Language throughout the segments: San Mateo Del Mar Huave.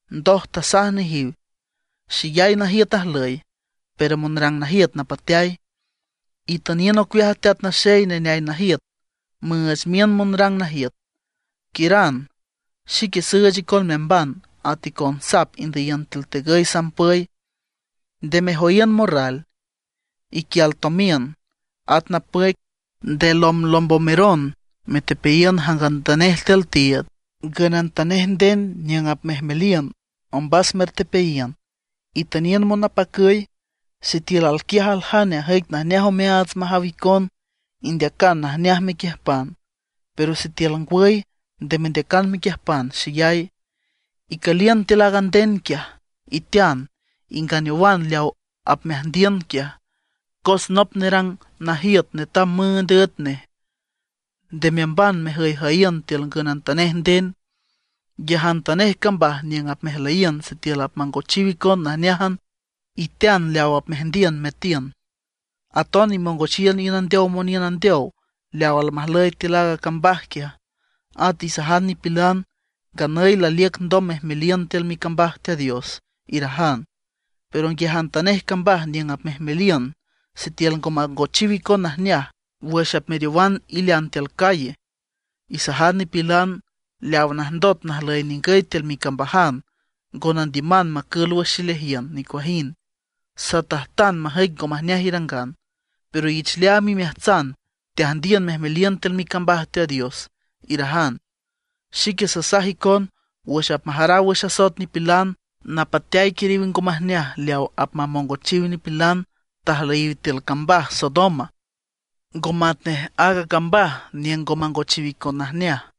Ndoj tasaj nejiw: ―Xeyay najiüt ajlüy, pero monrang najiüt napateay. Itüniün ocueaj a Teat Naxey neneay najiüt, müüch miün monrang najiüt. Quiüran; xique süüch icon meamban at icon sap indüyiün tiül tegüy sampüy. Nde mejoyiün morral, iquial tomiün, at napüic; nde lomblombomeron metepeayiün jangantanej tiül tiiüd. Ngünantanej nden niüng apmejmeliün, ombas mertepeayiün, itüniün monapacüy. Sitiül alquiaj aljane ajüic najneaj omeaats majaw icon, indeacan najneaj mequiüjpan; pero sitiül ngwüy, nde mendeacan mequiüjpan xeyay. Icüliün tiül aaga nden quiaj, itean, inganeowan leaw apmeajndiün quiaj, cos nop nerang najiüt netam müünd üet nej. Nde meamban mejüyjüyiün tiül ngünantanej nden. Nguiajantanej cambaj niüng apmejmeliün sitiül apmangochiw icon najneájan, itean leaw apmeajndiün meatiün. Aton imongochiün iün andeow moniün andeow leaw almajlüy tiül aaga cambaj quiaj, at isajan nipilan: “Nganüy laliüc ndom mejmeliün tiül micambaj Teat Dios”, irajan. Pero nguiajantanej cambaj niüng apmejmeliün, sitiül ngo mangochiw icon najneaj, wüx apmeriowan ilean tiül calle, isajan nipilan: “Leaw najndot najlüy ningüy tiül micambajan ngo nandiüman macül wüx xileajiün nicuajind; satajtan majüic ngo majneaj irangan. Pero ich leaam imeajtsan teajndiün mejmeliün tiül micambaj Teat Dios”, irajan. Xique sasaj icon, wüx apmajaraw wüx asoet nipilan, napateay quiriw ngo majneaj leaw apmamongochiw nipilan tajlüyiw tiül cambaj Sodoma, ngo matnej aaga cambaj niüng ngo mangochiw icon najneaj.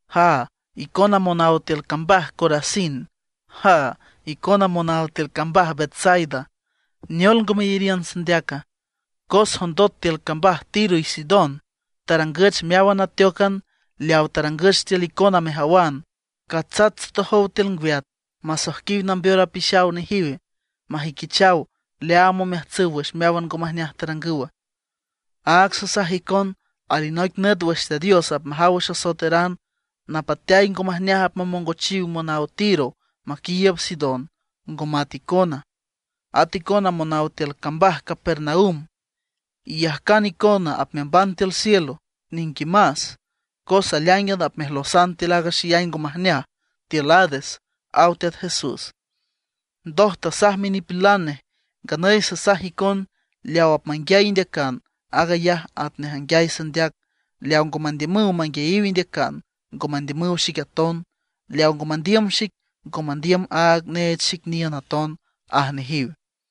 ’¡Jaa, icona monaw tiül cambaj Corazín! ¡Jaa, icona monaw tiül cambaj Betsaida! ¿Neol ngo meyariün sandeaca? Cos jondot tiül cambaj Tiro y Sidón tarangüch meáwan ateócan leaw tarangüch tiül icona mejawan, catsats tsotojow tiül ngwiat masoijquiw nambeor apixaw nejiw, majüiquichaw leaam omeajtsüw wüx meáwan ngo majneaj tarangüw. Áag sasaj icon, alinoic nüt wüx Teat Dios apmajaw wüx asoeteran, napateay ngo majneaj apmamongochiw monaw Tiro maquiiüb Sidón, ngo mat icona. At icona monaw tiül cambaj Capernaum, ¿iyajcan icona apmeamban tiül cielo? ¡Niquimas! Cos aleáingan apmejlosan tiül aaga xeyay ngo majneaj tiül Hades ―aw Teat Jesús. Ndoj tasaj minipilan nej: ―Nganüy sasaj icon, leaw apmanguiay indeacan, aag ayaj atnej anguiay sandeac; leaw ngo mandiümüw manguiayiw indeacan, ngo mandiümüw xic aton. Leaw ngo mandiüm xic, ngo mandiüm aaga neech xic niün aton ―aj nejiw.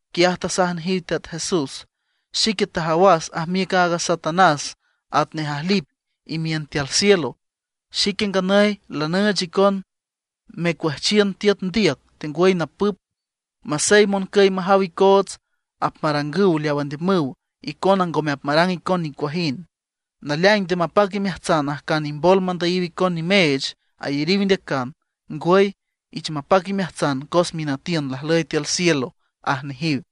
Quiaj tasaj nejiw Teat Jesús: ―Xique tajawas ajmiüc a Satanás atnej ajlip imiün tiül cielo. Xique nganüy lanüüch icon mecuüjchiün tiüt ndiüc tengwüy napüp. Masey moncüy majaw icoots apmarangüw leaw andiümüw, icona ngome apmarang icon nicuajind. Naleaing nde mapac imeajtsan ajcan imboloj mandüyiw icon nimeech ayariw indeacan; ngwüy, ich mapac imeajtsan cos minütiün lajlüy tiül cielo ―aj nejiw.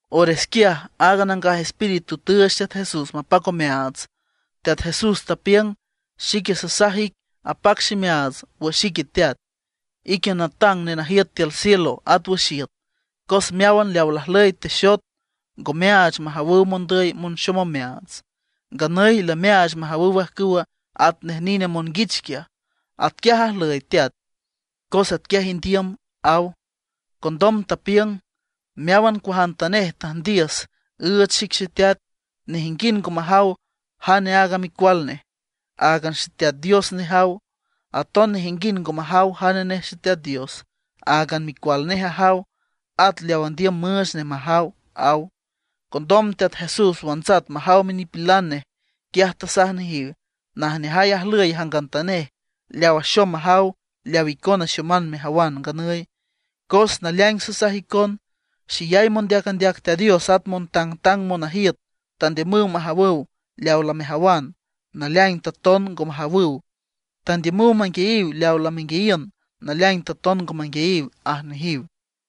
Ores quiaj aaga Nangaj Espíritu tüüch Teat Jesús mapac omeaats. Teat Jesús tapiüng: ―Xique sasaj ic apac ximeaats wüx ique Teat, ique natang nenajiüt tiül cielo at wüx iüt, cos meáwan leaw lajlüy texot, ngo meaach majawüw mondüy monxom omeaats. Nganüy lameaach majawüw ajcüwa atnej nine monguich quiaj. Atquiaj ajlüy, Teat, cos atquiaj indiüm ―aw. Condom tapiüng: ―Meáwan cuajantanej tüjndiüs, üüch xic Xeteat; nejinguind ngo majaw jane aaga micual nej, áagan Xeteat Dios nejaw. Aton nejinguind ngo majaw jane nej Xeteat Dios, áagan micual nej ajaw; at leaw andiüm müüch nej majaw ―aw. Condom Teat Jesús wantsat majaw minipilan nej, quiaj tasaj nejiw: ―Najneajay ajlüy jangantanej leaw axom majaw leaw icona ixoman mejawan nganüy. Cos naleaing sasaj icon, xeyay mondeac andeac Teat Dios at montangtang monajiüt tandiümüw majawüw leaw lamejawan; naleaing taton ngo majawüw. Tandiümüw manguiayiw leaw lamenguiayiün; naleaing taton ngo manguiayiw ―aj nejiw.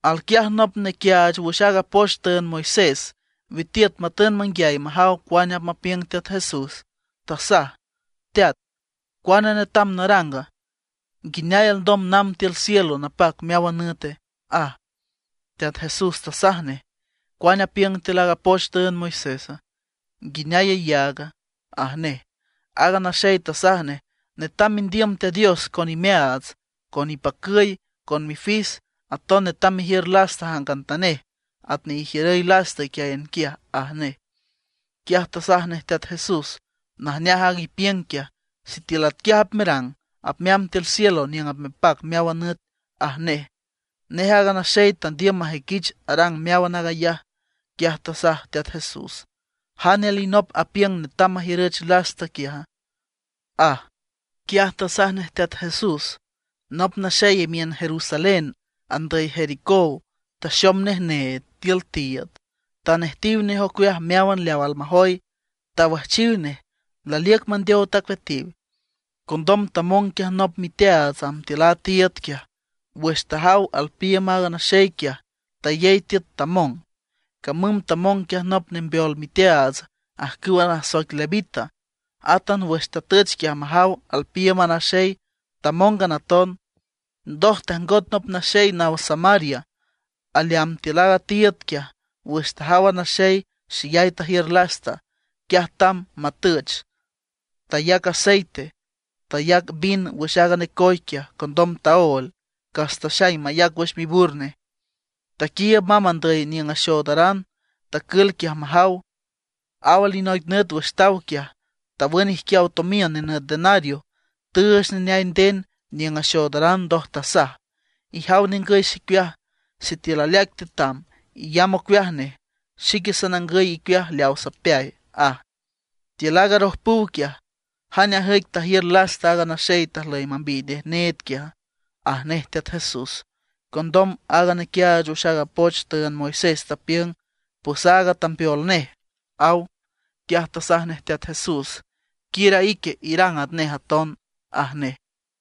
Alquiaj nop nequiaach wüx aaga poch tüünd Moisés, witiüt matün manguiay majaw cuane apmapiüng Teat Jesús, tasaj: ―Teat ¿cuane netam naranga, nguineay alndom namb tiül cielo napac meáwan nüte? ―aj. Teat Jesús tasaj nej: ―¿Cuane apiüng tiül aaga poch tüünd Moisésa? ¿Nguineay iyaag? ―aj nej. Aaga naxey tasaj nej: ―Netam mendiüm Teat Dios con imeaats, con ipacüy, con mifis; aton netam mejiür lasta jangantanej atnej ijiürüy lasta iquiáyan quiaj ―aj nej. Quiaj tasaj nej Teat Jesús: ―Najneaj aag ipiüng quiaj. Sitiül atquiaj apmerang apmeamb tiül cielo niüng apmepac meáwan nüt ―aj nej. Nej aaga naxey tandiüm majüiquich arang meáwan aag ayaj, quiaj tasaj Teat Jesús: ―¿Jane alinop apiüng netam majiürüch lasta quiaja? ―aj. Quiaj tasaj nej Teat Jesús: ―Nop naxey imiün Jerusalén andüy Jericó taxom nej need tiül tiiüd, tanejtiw nej ocueaj meáwan leaw almajoy, tawüjchiw nej, laliüc mandeow tacueatiw. Condom tamong quiaj nop miteaats amb tiül a tiiüd quiaj. Wüx tajaw alpiiüm aaga naxey quiaj, tayey tiüt tamong. Camüm tamong quiaj nop nembeol miteaats ajcüw nasoic levita. Átan wüx tatüch quiaj majaw alpiiüm a naxey, tamóngan aton. Ndoj tajngot nop naxey naw Samaria aleamb tiül aaga tiiüd quiaj. Wüx tajaw a naxey, xeyay tajiür lasta. Quiaj tamb matüch, tayac aceite, tayac a vin wüx aaga necoy quiaj. Condom taóel, cas taxaing mayac wüx mibur nej. Taquiiüb mamb andüy niüng axoodaran; tacül quiaj majaw. Aw alinoic nüt wüx taw quiaj, tawün ijquiaw tomiün nenüt denario, tüüch neneay nden niüng axoodaran. Ndoj tasaj: “Ijaw ningüy xicueaj, sitiül aleaic tetam, iyamb ocueaj nej. Xique sanangüy icueaj leaw sapeay”, aj. Tiül aaga arojpüw quiaj, ¿jane ajüic tajiür lasta aaga naxey tajlüy mambiy nej need quiaja? ―aj nej Teat Jesús. Condom aaga nequiaach wüx aaga poch tüünd Moisés tapiüng: ―Pues aaga tambeol nej ―aw. Quiaj tasaj nej Teat Jesús: ―Quiür a ique irang atnej aton ―aj nej.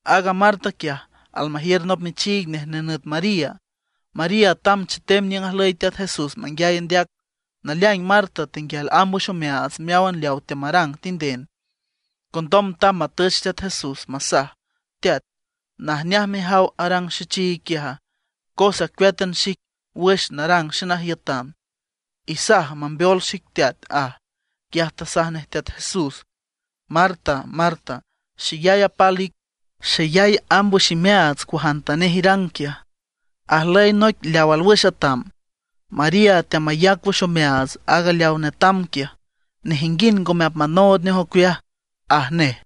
Aaga Marta quiaj, almajiür nop michiig nej nenüt María. María tamb chetem niüng ajlüy Teat Jesús manguiay andeac. Naleaing Marta tenguial amb wüx omeaats meáwan leaw teamarang tinden. Condom tamb matüch Teat Jesús masaj: ―Teat, ¿najneaj mejaw arang xechiig quiaja? Cos acueátan xic wüx narang xenajiütan. Isaj mambeol xic, Teat ―aj. Quiaj tasaj nej Teat Jesús: ―Marta, Marta, xeyay apal ic, xeyay amb wüx imeaats cuajantanej irang quiaj. Ajlüy noic leaw alwüx atam, María teamayac wüx omeaats aaga leaw netam quiaj, nejinguind ngome apmanood nej ocueaj ―aj nej.